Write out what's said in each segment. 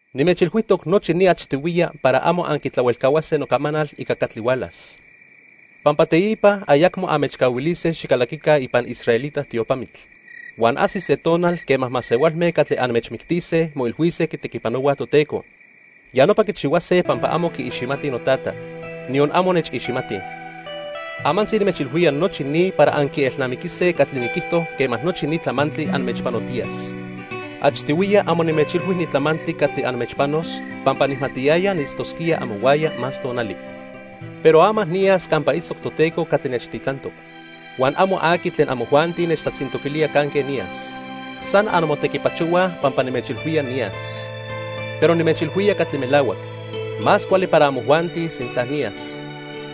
"Nimechilhuijtoc nochi ni achtihuiya para amo anquitlahuelcahuase nocamanal ica catli hualas. Pampa teipa ayacmo anmechcahuilise xicalaquica ipan israelita tiopamitl. Huan ajsis se tonal quema masehualme catli anmechmictise moilhuise quitequipanohuaj Toteco. Ya nopa quichihuase pampa amo quiiximatij noTata, niyon amo nechiximatij. Amantzi nimechilhuía nochi ni para anquielnamiquise catli niquijto quema nochi ni tlamantli anmechpanotiyas. "Achtihuiya amo nimechilhui ni tlamantli catli anmechpanos pampa nijmatiyaya niitztosquía amohuaya más tonali. Pero ama niyas campa itztoc Toteco catli nechtitlantoc. Huan amo aqui tlen amojuanti nechtlatzintoquilía canque niyas. San anmotequipachohuaj pampa nimechilhuía niyas. Pero nimechilhuía catli melahuac. Más cuali para amojuanti sintla niyas.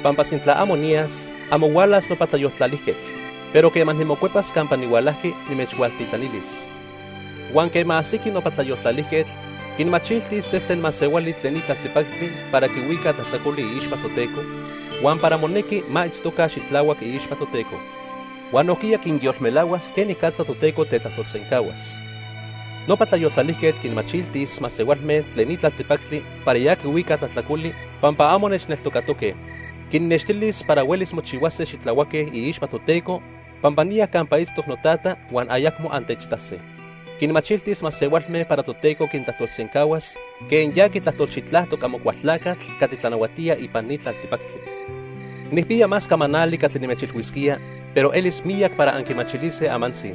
Pampa sintla amo niyas, amo hualas nopa Tlayoltlalijquetl. Pero quema nimocuepas campa nihualajqui, nimechhualtitlanilis. Huan quema ajsiqui nopa Tlayoltlalijquetl, quinmachiltis sesen masehuali tlen ni tlaltipactli para quihuica tlajtlacoli iixpa Toteco, huan para monequi ma itztoca xitlahuac iixpa Toteco. Huan nojquiya quinyolmelahuas quenicatza Toteco tetlajtolsencahuas. Nopa Tlayoltlalijquetl quinmachiltis masehualme tlen ni tlaltipactli para ya quihuicaj tlajtlacoli pampa amo nechneltocatoque. Quinnextilis para huelis mochihuase xitlahuaque iixpa Toteco pampa niya campa itztoc noTata huan ayacmo antechitase. Quinmachiltis masehualme para Toteco quintlajtolsencahuas quen ya quitlajtolxitlajtoc Amocualtlacatl catli tlanahuatía ipan ni tlaltipactli. "Nijpiya más camanali catli nimechilhuisquía, pero elis miyac para anquimachilise amantzi.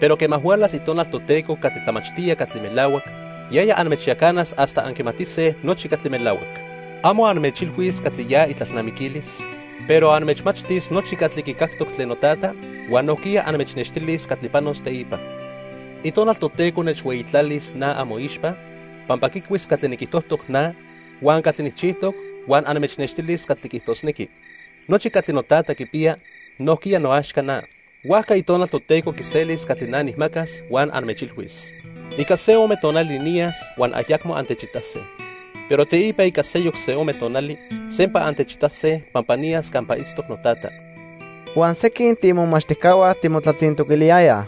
Pero quema hualas Itonal Toteco catli tlamachtía catli melahuac, yaya anmechyacanas hasta anquimatise nochi catli melahuac. Amo anmechilhuis catli ya itlalnamiquilis, pero anmechmachtis nochi catli quicactoc tlen noTata, huan nojquiya anmechnextilis catli panos teipa. Itonal Toteco nechhueyitlalis na amoixpa pampa quicuis catli niquijtojtoc na huan catli nijchijtoc, huan anmechnextilis catli quiijtosnequi. Nochi catli noTata quipiya, nojquiya noaxca na. Huajca Itonal Toteco quiselis catli na nijmacas huan anmechilhuis. "Ica se ome tonali niyas huan ayacmo antechitase. Pero teipa ica seyoc se ome tonali, sempa antechitase pampa niyas campa itztoc noTata." Huan sequin tiimomachtijcahua timotlatzintoquiliyayaj: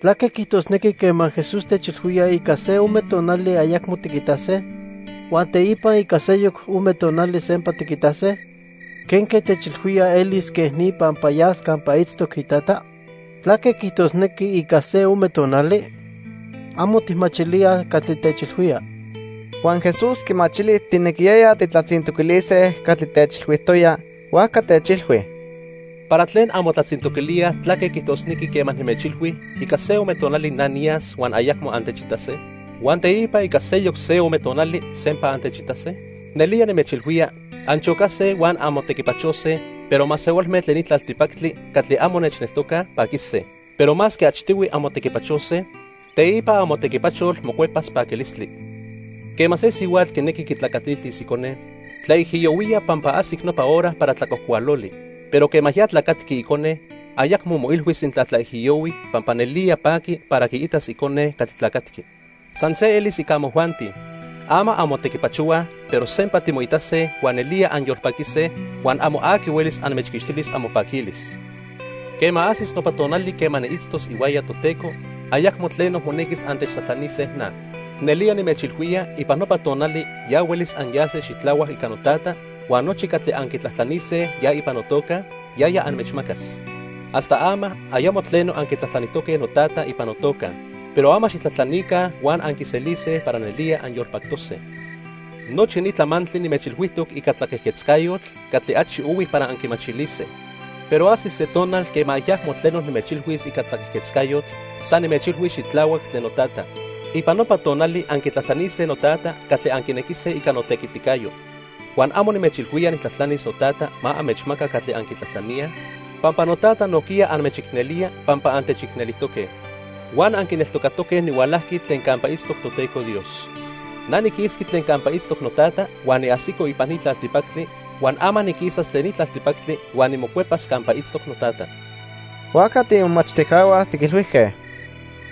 —¿Tlaque quiijtosnequi quema Jesús techilhuía ica se ome tonali ayacmo tiquitase, huan teipa ica seyoc se ome tonali sempa tiquitase? ¿Quenque techilhuía elis quej ni pampa yas campa itztoc iTata? ¿Tlaque quiijtosnequi 'ica se ome tonali'? Amo tijmachilíaj catli techilhuía. Huan Jesús quimachili tijnequiyayaj tijtlatzintoquilise catli techilhuijtoya, huajca techilhui: —¿Para tlen anmotlatzintoquilíaj tlaque quiijtosnequi quema nimechilhui ica se ome tonali na niyas huan ayacmo antechitase, huan teipa ica seyoc se ome tonali sempa antechitase? Nelía nimechilhuía anchocase huan anmotequipachose, pero masehualme tlen ni tlaltipactli catli amo nechneltocaj, paquise. Pero masque achtihui anmotequipachose, teipa amotequipachol mocuepas paquilistli. Quema se sihuatl quinequi quitlacatiltis icone, tlaijiyohuía pampa ajsic nopa hora para tlacuajcualoli, pero quema ya tlacatqui icone, ayacmo moilhuis sintla tlaijiyohui pampa nelía paqui para quiitas icone catli tlacatqui. San se elis ica amojuanti. Ama anmotequipachohuaj, pero sempa timoitase huan nelía anyolpaquise, huan amo aqui huelis anmechquixtilis amopaquilis. "Quema ajsis nopa tonali quema niitztos ihuaya Toteco, ayacmo tleno monequis antechtlajtlanise na. Nelía nimechilhuía ipan nopa tonali ya huelis anyase xitlahuac ica noTata huan nochi catli anquitlajtlanise ya ipan notoca, yaya anmechmacas. Hasta ama ayamo tleno anquitlajtlanijtoque noTata ipan notoca. Pero ama xijtlajtlanica huan anquiselise para nelía anyolpactose. "Nochi ni tlamantli nimechilhuijtoc ica tlaquejquetzcayotl catli achi ohui para anquimachilise, pero ajsis se tonal quema ayacmo tleno nimechilhuis ica tlaquejquetzcayotl, san nimechilhuis xitlahuac tlen noTata. Ipan nopa tonali anquitlajtlanise noTata catli anquinequise ica notequiticayo. Huan amo nimechilhuía nijtlajtlanis noTata ma anmechmaca catli anquitlajtlaníaj, pampa noTata nojquiya anmechicnelía pampa antechicnelijtoque. Huan anquineltocatoque nihualajqui tlen campa itztoc Toteco Dios. Na niquisqui tlen campa itztoc noTata huan niajsico ipan ni tlaltipactli, huan ama niquisas tlen ni tlaltipactli huan nimocuepas campa itztoc noTata." Huajca tiimomachtijcahua tiquilhuijque: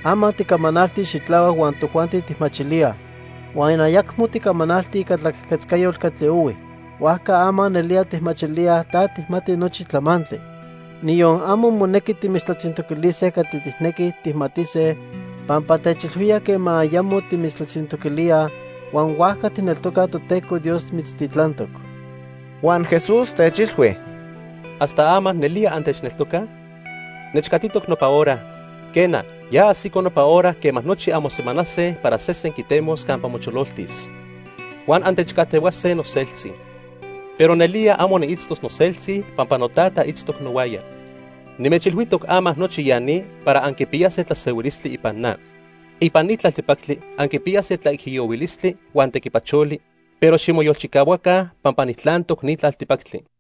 —Ama ticamanalti xitlahuac huan tojuanti tijmachilíaj, huan ayacmo ticamanalti ica tlaquejquetzcayotl catli ohui. Huajca ama nelía tijmachilíaj ta tijmati nochi tlamantli. Niyon amo monequi timitztlatzintoquilise catli tijnequij tijmatise pampa techilhuía quema ayamo timitztlatzintoquilíaj, huan huajca tijneltocaj Toteco Dios mitztitlantoc. Huan Jesús techilhui: —¿Hasta ama nelía antechneltocaj? Nechcatitoc nopa hora, quena, ya ajsico nopa hora quema nochi anmosemanase para sesen quitemos campa mochololtis. Huan antechcajtehuase noseltzi. Pero nelía amo niitztos noseltzi pampa noTata itztoc nohuaya. Nimechilhuijtoc ama nochi ya ni para anquipiyase tlasehuilistli ipan na. Ipan ni tlaltipactli anquipiyase tlaijiyohuilistli huan tequipacholi, pero ximoyolchicahuaca pampa nijtlantoc ni tlaltipactli.